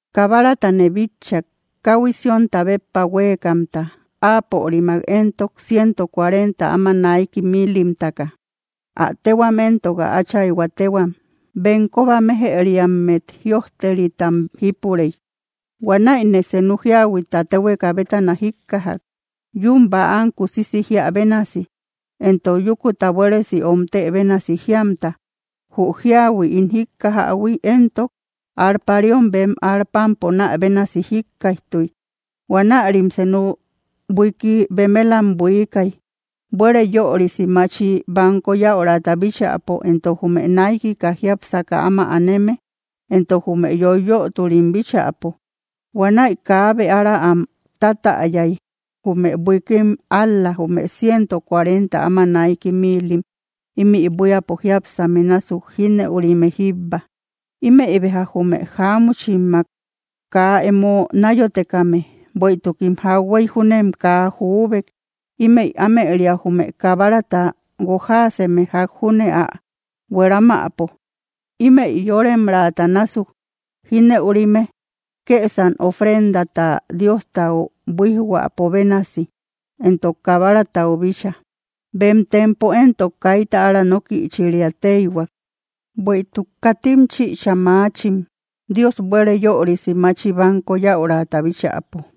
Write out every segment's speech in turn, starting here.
Kabaratane bitchak, káhui Siónta béppa huéekamta, áapörimak éntok, ciento cuarenta áma naiki miilimtaka. Ä téhuam entok ä Áchayhua téhuam, bem kóba méjëriammet jïojteritam jípurey. Huanäine senu jíahuita téhueka bétana jíkkajak, yún bäam kusisi jíä bénasi, éntok yúkuta buéresi omtë bénasi jíamta. Jü jíahui ín jíkkajaïhui éntok, arpariom bem arpam ponä bénasi jíkkaijtuy. Huanärim senu buiiki bemelam buiikay, buére yörisi machi banko yäurata bíchäpo, entok jume naikika jiápsaka áma aneme entok jume yoiyöturim bíchäpo. Huanäi kaabe ára am tátäyay, jume buiikim, ál‑la jume ciento cuarenta áma naiki miilim, ímï buíapo jiápsame násuk jínëurime jíbba. Ímëi béja jume jáamuchimmak kaa emo náyotekame, bueïtukim jahuey júnem kaa jubek. Ímëi ámëria, jume Kabarata guojaaseme ják júne ä hueramäpo. Ímëi yóremraata násuk jínëurime, kësam ofrendata Diostau buíjhuäpo bénasi, entok Kabaratau bícha. Bem tempo éntok, kaita ára nókïchiria téihuak, bueïtuk katim chïcha maachim, Dios buére yörisi machi banko yäurata bíchäpo.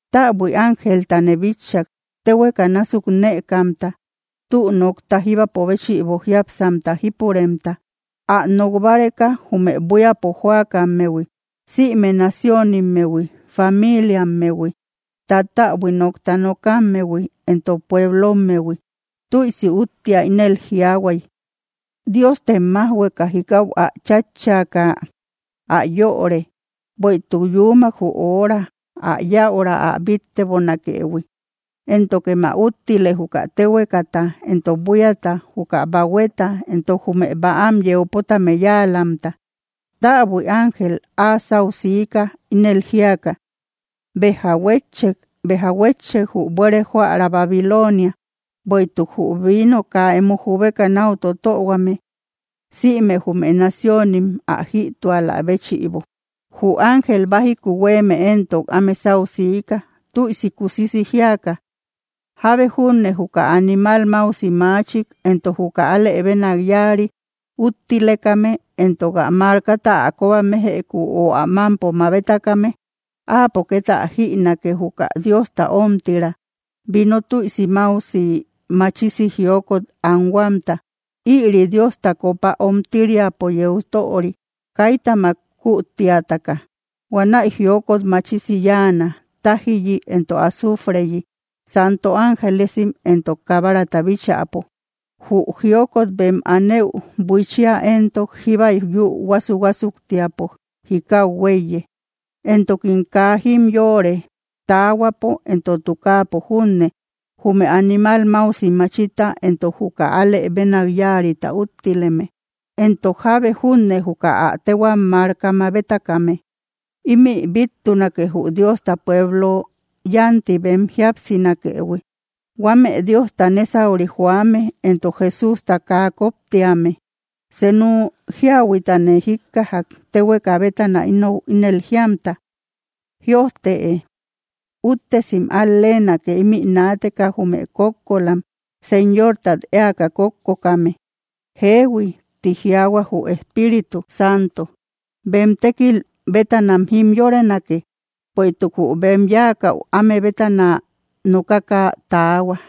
Täbui ángeltane bitchak, téhueka násuk nëkamta, tü nokta jíbapo béchïbo jiápsamta jípuremta, ä nok báreka jume buíapo jóakammehui, sïme naciónimmehui, famiiliammehui, tattäbui nókta nokammehui, éntok pueblommehui. Tüisi úttia ínel jiaahuay: —¡Diostem májhueka jikau ä chátchaaka ä yöre! Bueïtuk yuumak jü hora, ä yäura ä bíttebonakëhui. Éntokem ä úttile, juka téhuekata, entok buíata, juka bahueta, entok jume bäam yeu pótame yáalamta. Täbui ángel áa sáu siika, ínel jíaka: —¡Béja huétchek! ¡Béja huétchek, jü buére jóära Babilonia, bueïtuk jü vino kaa emo jubeka náu totöhuame, sïme jume naciónim ä jïtualä béchïbo! Jü ángel bájiku huéeme éntok áme sáu siika, tüisi kusisi jíaka: —Jábe júne juka animal máusi maachik, entok juka alë bénak yáari, úttilekame entok ä markata ä kóba méjëku, ö ä mámpo mabetakame, áapo ket ä jïnake, juka Diosta ómtirä vino tüisi máusi machisi jiokot anhuamta. Ïri Diosta copa ómtiriapo yeu töri, kaitamak kütiataka. Huanäi jiokot machisi yáana, tájiyi entok azufreyi, santo ángelesim entok Kabarata bíchäpo. Jü jiokot bem anëu buiichia éntok, jíba yü huásu‑huásuktiapo jikau huéiye. Entokim kaa jimyoore, taahuapo entok tukaapo junne, jume animal máusi machita entok juka alë bénak yáarita úttileme, entok jábe junne juka ä téhuam marka mabetakame. ¡Ímï bíttunake, jü Diosta pueblo yánti bem jíapsinakëhui, huame Diosta nésauri joame, entok Jesústa kaa koptíame! Senu jíahuitane jíkkajak, téhueka bétana inou ínel jíamta: —Jïojtëe: “Úttesim al-leenake, ímï naateka, jume kókkolam, Señortat éaka kókkokame.” Jeehui, ti jiaahua jü Espíritu Santo, bem tékil bétanam jimyorenake, bueïtuk jü bem yáakäu áme bétana nokaka taahua.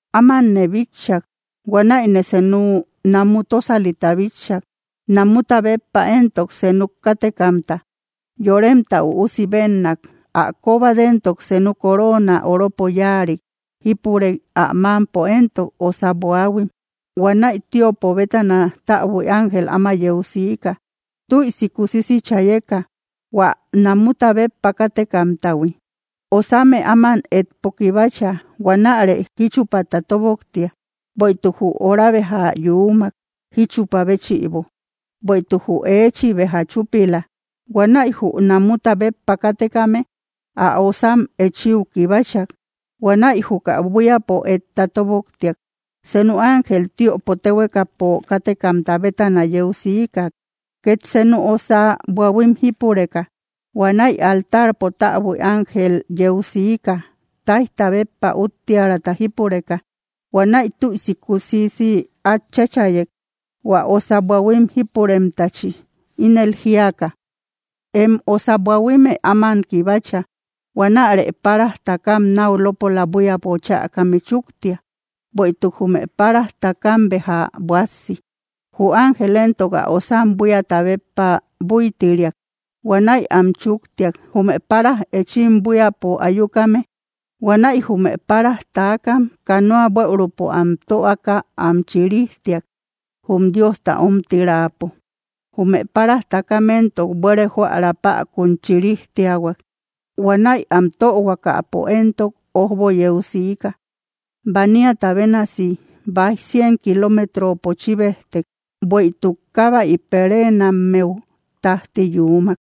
Ámanne bitchak, huanäine senu namu tósalita bitchak. Namuta béppa éntok, senuk kátekamta, Yoremta Üusi bénnak. Ä kóbat éntok senu coroona oropo yáarik jípurey ä mámpo éntok osa buaahuim. Huanäi tiöpo bétana täbui ángel áma yeu siika, tüisi kusisi chayeka, hua namuta béppa kátekamtahui: —¡Osamë áman etpo kibacha! ¡Huanärë jíchupata toboktia, bueïtuk jü hora béja yuumak, jíchupä béchïbo! Bueïtuk jü eechi béja chúpila. Huanäi jü namuta béppa kátekame ä osam echíu kibachak. Huanäi juka buíapo etta tóboktiak. Senu ángel tiöpo téhuekapo kátekamta bétana yeu siika, ket senu osa buahuim jípureka. Huanäi altarpo täbui ángel yeu siika, táijta béppa úttiärata jípureka. Huanaï tüisi kusisi át cháchayek, hua osa buahuim jípuremtachi, ínel jíaka: —¡Em osa buahuimë áman kibacha! ¡Huanärë paraj takam náu lópola buíapo chäkame chúktia, bueïtuk jume paraj takam béja buássi! Jü ángel éntok ä osam buíata béppa búitiriak. Huanäi am chúktiak, jume páraj taakam, jume páraj eechim buíapo ayukame. Huanäi jume páraj takam canoa bueürupo am töaka am chirijtiak, jum Diosta omtirapo. Jume páraj takam éntok, buére jóära päkun chirijtiahuak. Huanäi am töhuakapo éntok, ójbo yeu siika. Baniata bénasi báij cien kiloometropo chíbejtek, bueïtuk kábäi pereenammeu tájti yuumak.